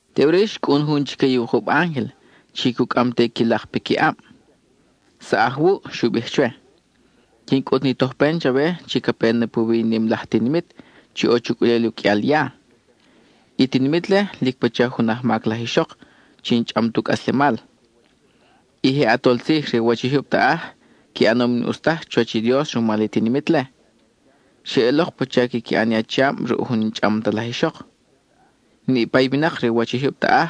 Teʼuri xcʼun jun chique i wukub ángel, chi cucʼam te i qui lak piqui ʼab. —Saʼaj wuʼ —xu bij chwe—, quin cʼut ni tojpen chawe chi ca pe na puwi i nim laj tinimit chi ʼo chucʼulel u qʼuial ya. I tinimit-le lic pacha jun ajmac laj ixok chi n-chʼam tu cʼaslemal. I je ʼatol tzij re u wach i jyub taʼaj qui ʼanom i n-ʼus taj chuwach i Dios rumal i tinimit-le; xeʼelok pacha quiqui ʼan i achiab ruʼ jun n-chʼam ta laj ixok. Niʼpa i winak re u wach i jyub taʼaj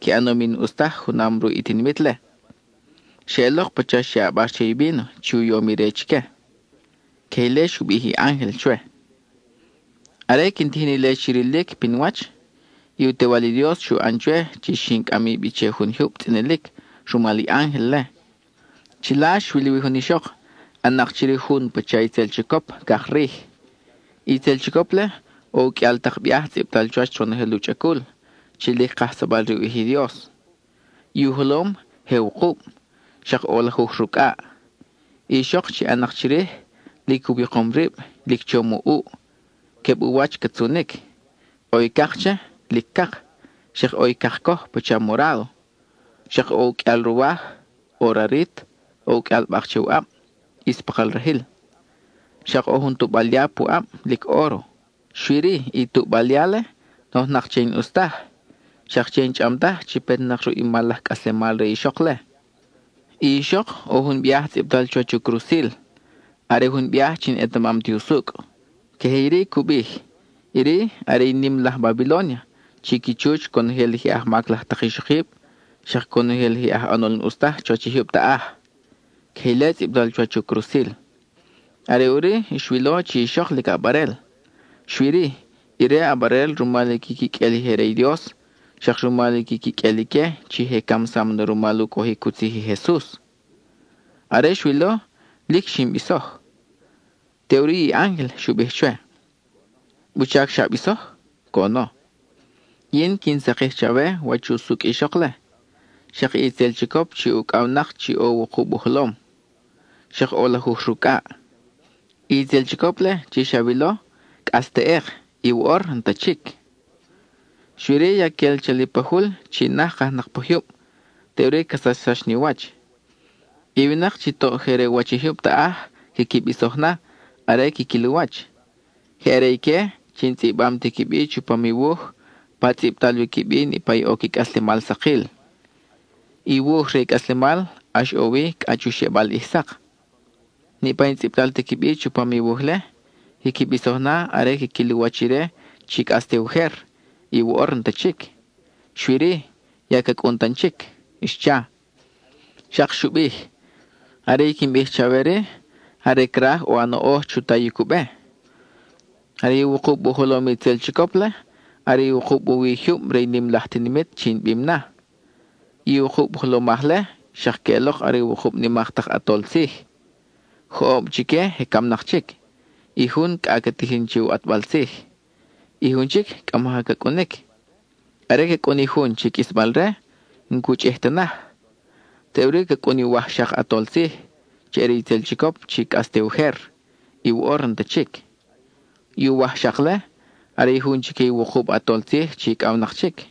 qui ʼanom i n-ʼus taj junam ruʼ i tinimit-le; xe ʼelok pacha xe ʼabar che i víno chi u yom ire chique. (Queje ile xu bij i ángel chwe.) Are quin tijin ile chi rilic pinwach, i u Tewal i Dios xu ʼan chwe chi xin cʼami bi che jun jyub tzʼinilic rumal i ángel-le. Chila xwil wi jun ixok, ʼan-nak chirij jun pacha itzel chicop cak rij. I itzel chicop-le, ʼo u qʼuial tak biaj tzʼibtal chuwach ronojel u chʼacul, chi lic kajsabal re u ʼij i Dios. I u jolom, je wukub, xak ʼo lajuj rucʼaʼ. I ixok chi ʼan-nak chirij, lic u wikom rib, lic chom u ʼuʼ, queb u wach ca tzunic: ʼo i cak che, lic cak; xak ʼo i cakcoj pacha morádo. Xak ʼo u qʼuial ruwaj, ʼo rarit, ʼo u qʼuial bak che u ʼab, ʼis pakal rajil. Xak ʼo jun tuʼbal ya pu ʼab, lic óro. Xui-ri, i tuʼbal ya-le, nojnak che i n-ʼus taj, xak che i n-chʼam taj chi petnak ruʼ i mal laj cʼaslemal re i ixok-le. I ixok ʼo jun biaj tzʼibtal chuwach u crusil, are jun biaj chi n-etamam ti usucʼ. Queje iri cu bij: “Iri are i nim laj Babilónia, chi qui chuch conojel i je ajmac laj tak ixokib, xak conojel i je aj ʼanol n-ʼus taj chuwach i jyub taʼaj.” Queje ile tzʼibtal chuwach u crusil. Are ʼuri xwilo chi i ixok lic ʼabarel, xui-ri, ire ʼabarel rumal i qui quiqʼuel i je re i Dios, xak rumal i qui quiqʼuel ique chi je camsam na rumal u cojic u tzij i Jesus. Are xwilo, lic xin bisoj. Teʼuri i ángel xu bij chwe: —¿Wuchac xa bisoj? —coʼono—. Yin quin sakij chawe wach usucʼ i ixok-le, xak i itzel chicop chi ucʼawnak chi ʼo wukub u jolom, xak ʼo lajuj rucʼaʼ. I itzel chicop-le chi xawilo, cʼas teʼek, y woʼor n-ta chic. Xui-ri ya quel chali pa jul chi naj kajnak pa jyub, teʼuri ca sachsax ni u wach. I winak chi toʼ je re u wach i jyub taʼaj quiqui bisoj na, are quiquil u wach. Je are ique chi n-tzʼibam ti qui bi chupam i wuj pa tzʼibtal wi qui bi niʼpa i ʼo qui cʼaslemal sakil. I wuj re i cʼaslemal ʼax ʼo wi cʼa chu xebal ʼij sak. Niʼpa i n-tzʼibtal ti qui bi chupam i wuj-le, quiqui bisoj na are quiquil u wach ire chi cʼas te ujer, y woʼor n-ta chic, xui-ri, ya ca cʼun tan chic —xcha. (Xak xu bij:) —Are i quin bij chawe-ri, are craj ʼo a noʼoj chu tayic u be. I wukub u jolom i itzel chicop-le are i wukub u wi jyub re i nim laj tinimit chi in bim na. I wukub jolomaj-le xak queʼelok are wukub nimak tak ʼatol tzij. Joʼob chique je camnak chic, y jun cʼa ca tijin che u ʼatbal tzij; i jun chic cʼa maja ca cʼunic. Are ca cʼun i jun chi qʼuisbal-re, n-cu chʼij ta naj. Teʼuri ca cʼun i uwajxak ʼatol tzij, chi are itzel chicop chi cʼas te ujer, y woʼor n-ta chic. I uwajxak-le, are jun chique i wukub ʼatol tzij chi icʼawnak chic.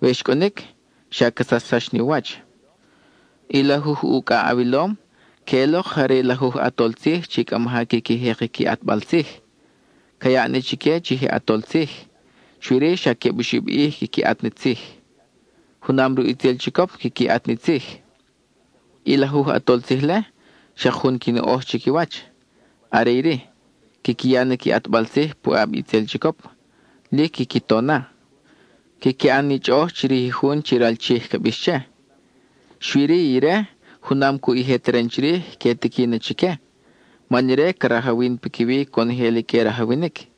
We xcʼunic, xa ca sachsax ni u wach. I lajuj ucʼaʼ awilom, queʼelok je are lajuj ʼatol tzij chi cʼa maja quiqui jek i qui ʼatbal tzij. Ca yaʼ na chique chi je ʼatol tzij, xui-ri, xa queb oxib ʼij quiqui ʼat na tzij. Junam ruʼ itzel chicop quiqui ʼat ni tzij. I lajuj ʼatol tzij-le, xak jun qui noʼoj chiquiwach: quiqui ya na qui ʼatbal tzij puʼab i itzel chicop; lic quiqui to na. Quiqui ʼan ni chʼoʼoj chirij i jun chi ral Chij ca bix che. Xui-ri ire, junam cuʼ i je teren chirij, que tiqui na chique, man ire ca rajawin piquiwi conojel i que rajawinic;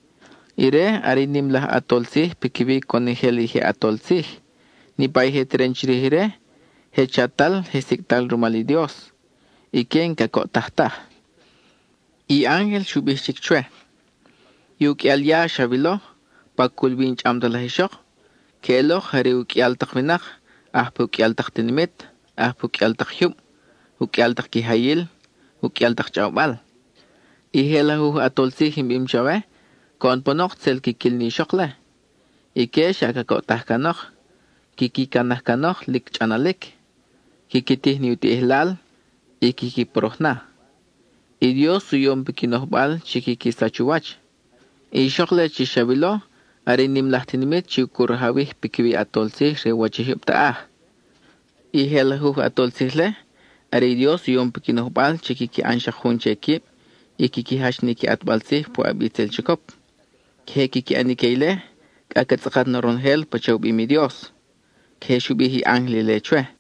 ire are i nim laj ʼatol tzij piquiwi conojel i je ʼatol tzij, niʼpa i je teren chirij ire, je chatal y je sicʼtal rumal i Dios; ique n-cacoʼtaj taj. I ángel xu bij chic chwe: —I u qʼuial ya xawilo, pa cul wi i n-chʼam ta laj ixok queʼelok je are u qʼuial tak winak aj pa u qʼuial tak tinimit, aj pa u qʼuial tak jyub, u qʼuial tak quijayil, u qʼuial tak chʼawbal. I je lajuj ʼatol tzij in bim chawe, coʼon panok tzel quiquil ni ixok-le. Ique xa cacoʼtaj canok; quiqui canaj canok lic chʼanalic. Quiqui tij ni u tiʼijlal, y quiqui poroj na. I Dios u yom piqui nojbal chi quiqui sach u wach. I ixok-le chi xawilo are i nim laj tinimit chi cu rajawij piquiwi i ʼatol tzij re u wach i jyub taʼaj. I je lajuj ʼatol tzij-le, are i Dios u yom piqui nojbal chi quiqui ʼan xak jun che quib y quiqui jach ni qui ʼatbal tzij puʼab i itzel chicop. Queje quiqui ʼan ique ile cʼa ca tzʼakat na ronojel pacha u bim i Dios. (Queje xu bij i ángel ile chwe.)